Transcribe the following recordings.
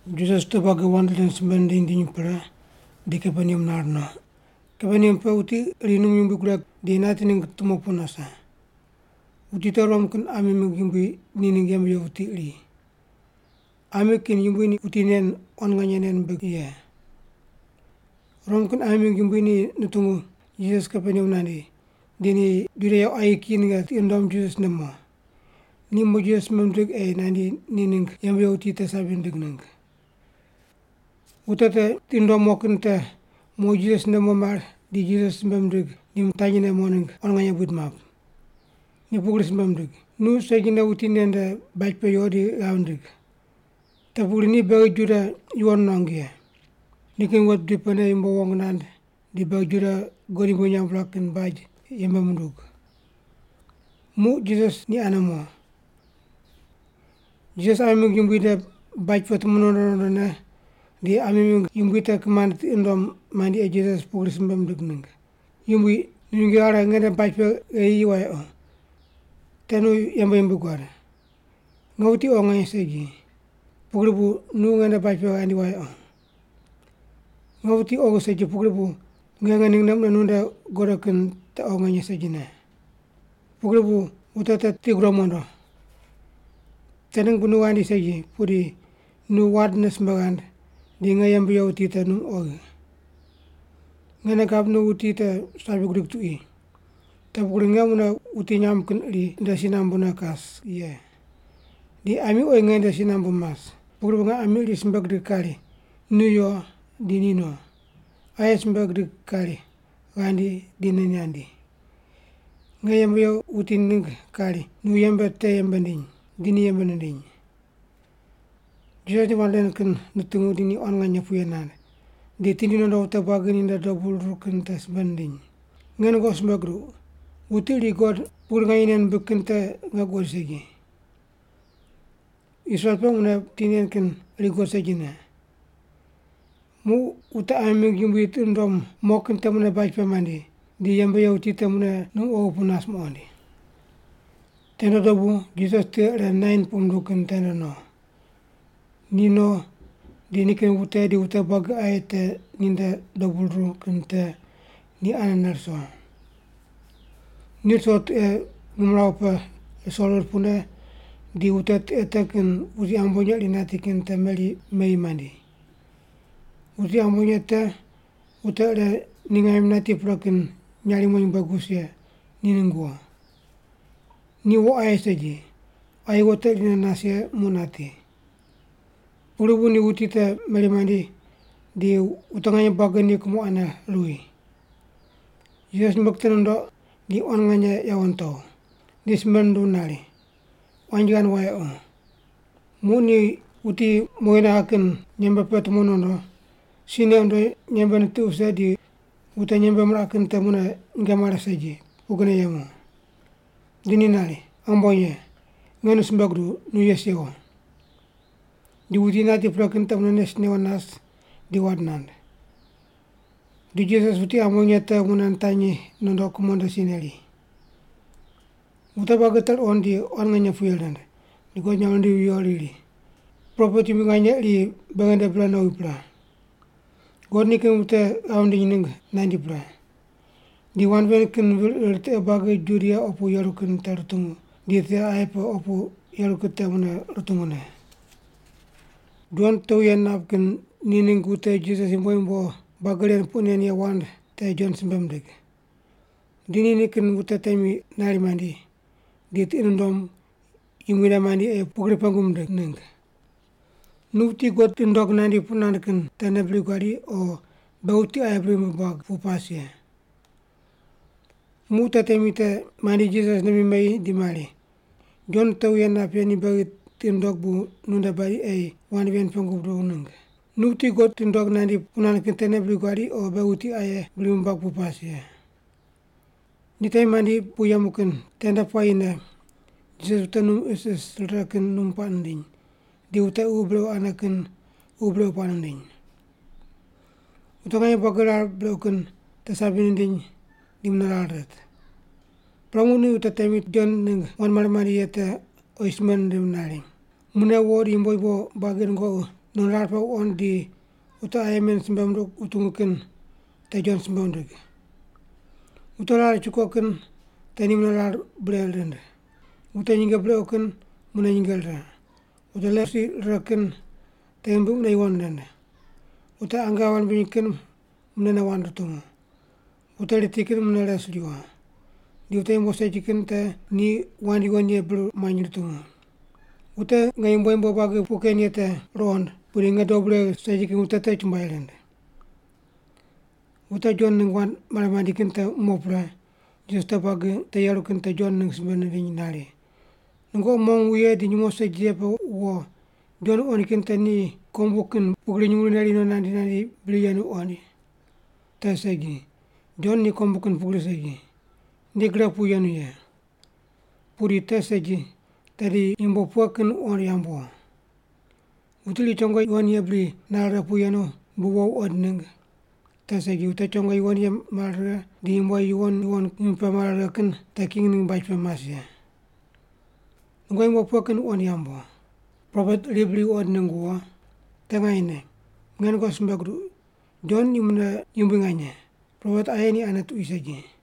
Jisas wute buagi wand ren simbe nindiny nindiny pre di Kaperneam nar no. Kaperneam pe wuti iri num yumbui gureg di nati ningg tumo pu nase. Wuti te Rom kin ami mingg yumbui ni ningg yembe ye wuti iri. Ami kin yumbui ni wuti nen quan nganye nei nimbig ye. Rom kin ami mingg yumbui ni nutungu Jisas Kaperneam nandi, di ni Juda ye quayi kiyi ninge tiqi nundom Jisas nde mo. Ni mo Jisas simbe mindig ei nandi ni ningg yembe ye wuti te sabi nindig ningg. Wute te tiqi nundom mo kin te mo Jisas nde mo mar di Jisas simbe mindig di mitanyi ne mo ningg quan nganye buid map. Ni pugri simbe mindig, “Nu segine wuti nen nde baj pe yo di ghav ndig. Te pugri ni beghi Juda yuwon nuangu ye. Nikin wet bidi pene yumbo wong nand di beghi Juda God yumbui nyamb mirang kin baj yembe mundug.” Muq Jisas ni ane mo. Jisas ami mingg yumbui nde baj pe tumo nondo nondone di ami mingg yumbui te kimand tiqi nundom mandi ei Jisas pugri simbe mindig ningg, “Yumbui, nu nyinge ghare nge nde baj pe gheyi yi wayequ, te nu yembe yumbui guad. Nge wuti oghi nganye segi, pugri bu nu ngende baj pe ghandi wayequ. Nge wuti oghi segi pugri bu nge nge ningne mune nu nde godo kin te oghi nganye segine. Pugri bu wute te tiqi gudom mondo. Te ningg bu nu ghandi segi, pudi nu wandne simbe ghand, di nge yembe ye wuti te num oghi. Nge nei gab nu wuti te sabi gudig tuqui. Te pugri nge mune wuti nyamb kin iri nde si nambune kas ye, di ami oyi nge nde si nambu mas. Pugri bu nge ami iri simbe gidig kari, ‘Nu yo,’ di ni no; aye simbe gidig kari, ‘Ghandi,’ di ni nandi; nge yembe ye wuti ningg kari, ‘Nu yembe te yembe ndiny,’ di ni yembe nindiny.” Jisas ni wand ren kin nutungu di ni quan nganye puye nand, di tindi nondo wute buagi ni nde dobu ruru kin te simbe nindiny, “Nge nungoqi simbe guduq, wuti iri God pugri nganye nei nimbig kin te nge guqoid segi. Israel pe mune wuti nen kin iri guqoid segine.” Muq wute ami mingg yumbui tiqi nundom mo kin te mune baj pe mandi, di yembe ye wuti te mune num oghi pu nas muqoind. Tende dobu Jisas tiqe ire Nain puq munduw kin tende no. Ni no di nikin wute di wute buagi aye te ni nde dobu ruru kin te ni anene riso. Ni riso tiqe ngimrawu pe riso rir pune di wute tiqe te kin wuti ambonye iri nati kin te meri meyi mandi. Wuti ambonye te wute ire ni ngaim nati pre kin nyarimo nyumbueg wus ye ni ningg wo. Ni wo aye segi, quayi wo te irine nas ye muq nati. Pugri bu ni wuti te meri mandi di wute nganye buagi ni kumo ane ruwi. Jisas nyumbueg te nundoq di quan nganye yawo nitow. Di simbe nunduw nari, “Quanji ghand wayequ.” Muq ni wuti mowi naghe kin nyembe pe tumo nondo, si neq wundo nyembe nitiq wuse di wute nyembe miraq kin te mune nyinge mare segi, pugrine yemu. Di ni nari, “Ambonye, nge nu simbe guduw, nu yes yewo!” Di wuti nati pre kin te mune nes newo nas di wand nand. Di Jisas wuti ambonye te mune nitanyi nondo kumo nde si neri. Wute buagi te ruqond di quan nganye puye rind, di God nyamb rindivi viyo riri, “Propet yumbui nganye iri beghi nde bre nowi pre. God nikin wute ghav nindiny ningg nandi pre.” Di wand ven kin vir ir tiqe buagi Judia opu yeru kin te rutungu, di tiqe aye pe opu yeru kin te mune rutungu ne. Jon wute wuye nap kin ni ningg wute Jisas yumbo yumbo buagi ren puq nen ye wand te Jon simbe mindig. Di ni nikin wute temi nari mandi, di tiqi nundom Yumbui nde mandi ei pugri pengu mindig ningg, “Nu wuti God tiqi nundog nandi puq nand kin tene bri guadi o beghi wuti aye bri ghimbi buag pu pas ye?” Muq wute temi te mandi Jisas nde mi meyi di mari, “Jon wute wuye nap ye ni beghi tiqi nundog bu nu nde badi ei wand ven pengu buduw ningg, ‘Nu wuti God tiqi nundog nandi puq nand kin tene bri guadi o beghi wuti aye bri ghimbi buag pu pas ye’?” Ni temi mandi pu yemu kin tende puayine Jisas wute num isis rire kin num puaq nindiny, di wute ququ brequ ane kin ququ brequ puaq nindiny. Wute nganye buagi rar brequ kin te sabi nindiny di mune rar rit. Pre, muq ni wute temi Jon ningg wand mare mandi ye te oyi simbe nindim nari, “Mune wo di yumbo yumbo buagi nungoqi non rar pe wuqond di wute aye men simbe munduq wutungu kin te Jon simbe wundig: Wute rar chukoq kin te ni mune rar bure rind, wute nyinge brequ kin mune nyinge rire, wute leprosi riraq kin te ghimbi mune yuwon rind, wute ange ghave rimbiny kin munene wand rutungu, wute riti kin mune res riwo, di wute yumbo segi kin te ni wand yuwon ye bir muany rutungu. Wute nge yumbo yumbo buagi puq ken ye te ruqond, pudi nge dob regh segi kin wute te chumbuai rind.” Wute Jon ningg wand mare mandi kin te mo pre, Jisas wute buagi te yeru kin te Jon ningg simbe nindiny nari, “Nungoqi mong wuye di nyumo segi ye pe wo Jon wuqoind kin te ni kombu kin pugri nyumurighi neri no nandi nandi bri yenu wuqoind? Te segi, Jon ni kombu kin pugri segi, ni gre pu yenu ye. Pudi te segi, tedi yumbo pughe kin wuqond yamb wo? Wuti iri chongo yuwon ye bri nare righe pu yenu bu wo wuqoind ningg? Te segi, wute chongo yuwon ye mare righe di yumbo yuwon yuwon ghimbi pe mare righe kin te king ningg baj pe mas ye. Nungoqi yumbo pughe kin wuqond yamb wo? Propet iri bri wuqoind ningg wo? Te nganyene, nge nungoqi simbe guduq, Jon ni mune yumbui nganye, propet aye ni ane tuqui segi.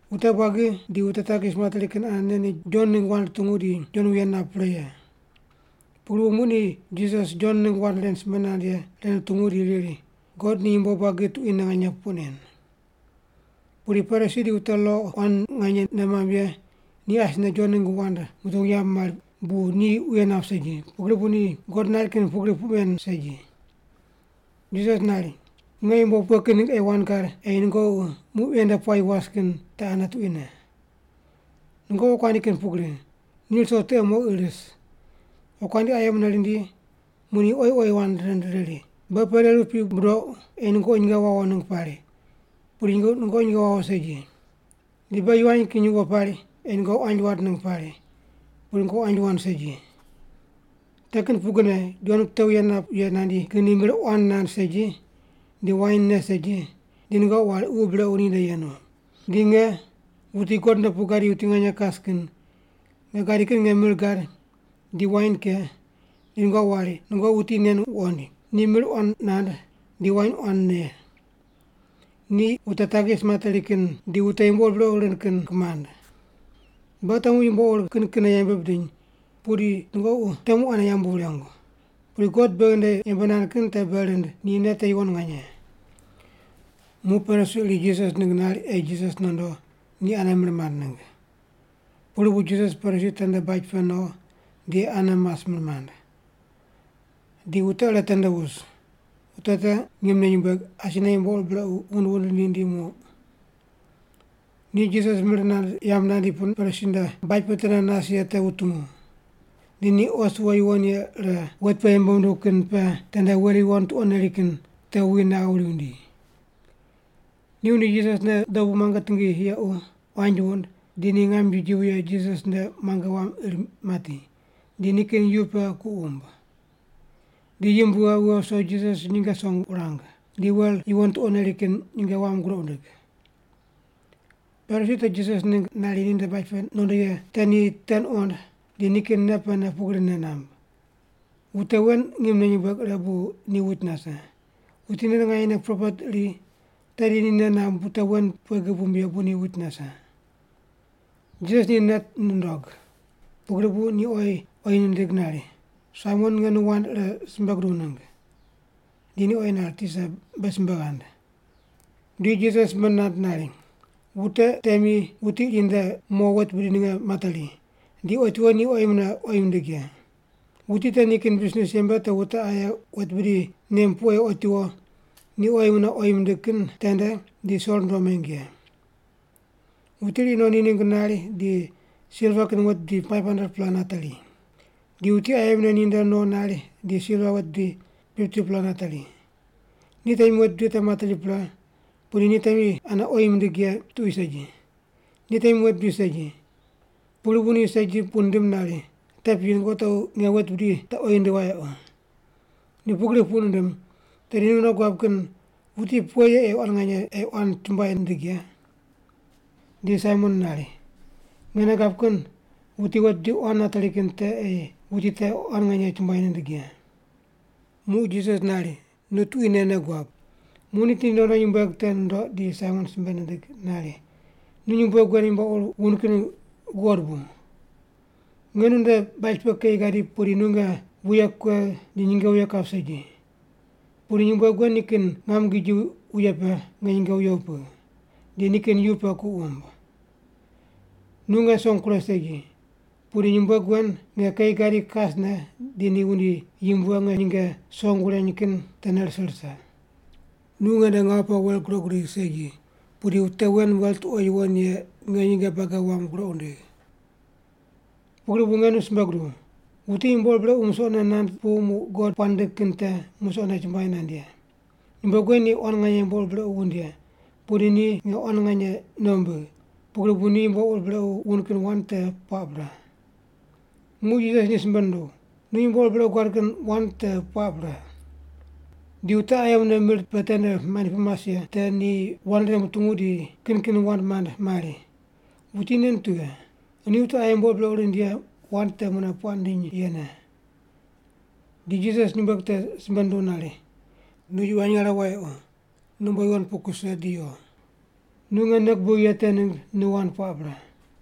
Wute buagi di wute takis materi kin anene ni Jon ningg wand rutungu di Jon wuye nap pre ye. Pugri bu muq ni Jisas Jon ningg wand ren simbe nand ye ren rutungu di riri God ni yumbo buagi tuquine nganye puq nen. Pudi Parisi di wute lo quan nganye nei mamb ye ni asine Jon ningg wand mutungu yambu mari bu ni wuye nap segi, pugri bu ni God nari kin pugri puq men segi. Jisas nari, “Nge yumbo pughe kin ningg ei wand gad ei nungoqi muq ven nde puayi was kin te ane tuquine? Nungoqi wokuandi kin pugri, ni ruso tiqe moqi ris, wokuandi aye mune rindi muq ni oyi oyi wand rind riri, ‘Beghi pereru piq budouq ei nungoqi nyinge wawo ningg pari, pudi nungoqi nyinge wawo segi. Di beghi yivany kin yuwo pari ei nungoqi quanji wand ningg pari, pudi nungoqi quanji wand segi.’ Te kin pugrine Jon wute wuye nap ye nandi kin ni mir quan nand segi, di wain ne segi, di nungoqi wari ququ brequ ninde yenu. Di nge, wuti God nde pu gadi wuti nganye kas kin, nge gadi kin nge mir gad di wain ke di nungoqi wari, ‘Nungoqi wuti nen wuqoind. Ni mir quan nand di wain quan ne, ni wute takis materi kin di wute yumbo ur brequ rind kin kimand.’ Beghi temu yumbo ur kin kinne yembe bidiny pudi nungoqi temu ane yambu wurengu. Pudi God beghi nde yembe nand kin te bei rind ni nei te yuwon nganye.” Muq Parisi iri Jisas ningg nari ei Jisas nondo ni ane mir mand ningg. Pugri bu Jisas Parisi tende baj pe no di ane mas mir mand. Di wute ire tende wus. Wute te ngimne nyumbueg, asine yumbo ur brequ wund wund rindi rindi muq. Ni Jisas mir nand yamb nandi pu Parisi nde baj pe tende nas ye te wutungu. Di ni os wo yuwon ye ire wet pe yembe munduw kin pe tende wel yuwon tuqo neri kin te wuwi naghe wuri wundi. Ni wundi Jisas nde dobu muange tingi yequ, quanji wund, di ni ngam giji wuye Jisas nde muange wam ir mati, di nikin yu pe ku wumb. Di yimb wughe, wughe wuso Jisas nyinge song wurang, di wel yuwon tuqo neri kin nyinge wam groq wundig. Parisi te Jisas ningg nari ninde baj pe nondo ye te ni te nuqond di nikin nei pene pugri nei namb, “Wute wen ngimne nyumbueg ire bu ni wuit nase. Wuti nen nganyene propet iri, tedi ni nei namb wute wen pughe gib wumb ye bu ni wuit nase.” Jisas ni nei nundog, pugri bu ni oyi oyi nindig nari, “Saimon, nge nu wand ire simbe guduw ningg.” Di ni oyi nari, “Tisa, be simbe ghand.” Di Jisas simbe nand nari, “Wute temi wuti iri nde mo wet bidi ninge materi, di otiwo ni oyi mune oyi mindig ye. (Wuti te nikin bisnis yembe te wute aye wet bidi nem pu ei otiwo ni oyi mune oyi mindig kin tende di so rundo meng ye.) Wuti iri no ni ningg nari di silva kin wet bidi 500-pela nateri. Di wuti aye mune ni nde no nari di silva wet bidi 50-pela nateri. Ni temi wet bidi te materi pre, pudi ni temi ane oyi mindig ye tuqui segi, ni temi wet bidi segi. Pugri bu ni segi puq nindim nari, ‘Te piyi, nungoqi tequ ane nge wet bidi te oyi wundigh wayequ.’ Ni pugri puq nindim, tedi nu nei guab kin wuti pughe ye ei ni quan chumbuai nindig ye?” Di Saimon nari, “Nge nei gab kin wuti wet bidi quan nateri kin te ei wuti te quan nganye chumbuai nindig ye.” Muq Jisas nari, “Nu tuquine nei guab.” Muq ni tindi nondo nyumbueg te nundoq di Saimon simbe nindig nari, “Nu nyumbueg wen yumbo ur wund kin guqod bu? Nge nu nde baj pe keyi gadi pudi nu nge wuye kuegh di nyinge wuye kap segi. Pudi nyumbueg wen nikin ngam giji wuye pe nge nyinge wuye wupigh, di nikin yu pe ku wumb. Nu nge song kuregh segi, pudi nyumbueg wen nge keyi gadi kasne di ni wundi yimb wughe nge nyinge song wureny kin tene rise rise. Nu nge nde ngawu pe wel groq gudigh segi, pudi wute wen wel tuqo yuwon ye nge nyinge bage wam groq wundigh. Pugri bu nge nu simbe guduw, wuti yumbo ur brequ musoqne nand pu muq God puaq nindig kin te musoqne chumbuai nand ye. Nyumbueg wen ni quan nganye yumbo ur brequ wund ye, pudi ni nge quan nganye nei wumbigh, pugri bu ni yumbo ur brequ wund kin wand te puaq pre.” Muq Jisas ni simbe nunduw, “Nu yumbo ur brequ guad kin wand te puaq pre.” Di wute aye mune mir pe tende mandi pu mas ye te ni wand ren mutungu di kin kin wand mand mari, “Wuti nen tughe? Ni wute aye yumbo ur brequ rind ye wand te mune puaq nindiny yene?” Di Jisas nyumbueg te simbe nunduw nari, “Nu yivany ghare wayequ, nu umbo yuwon pu kuse di yo. Nu nge nei gubigh ye te ningg nu wand puaq pre.”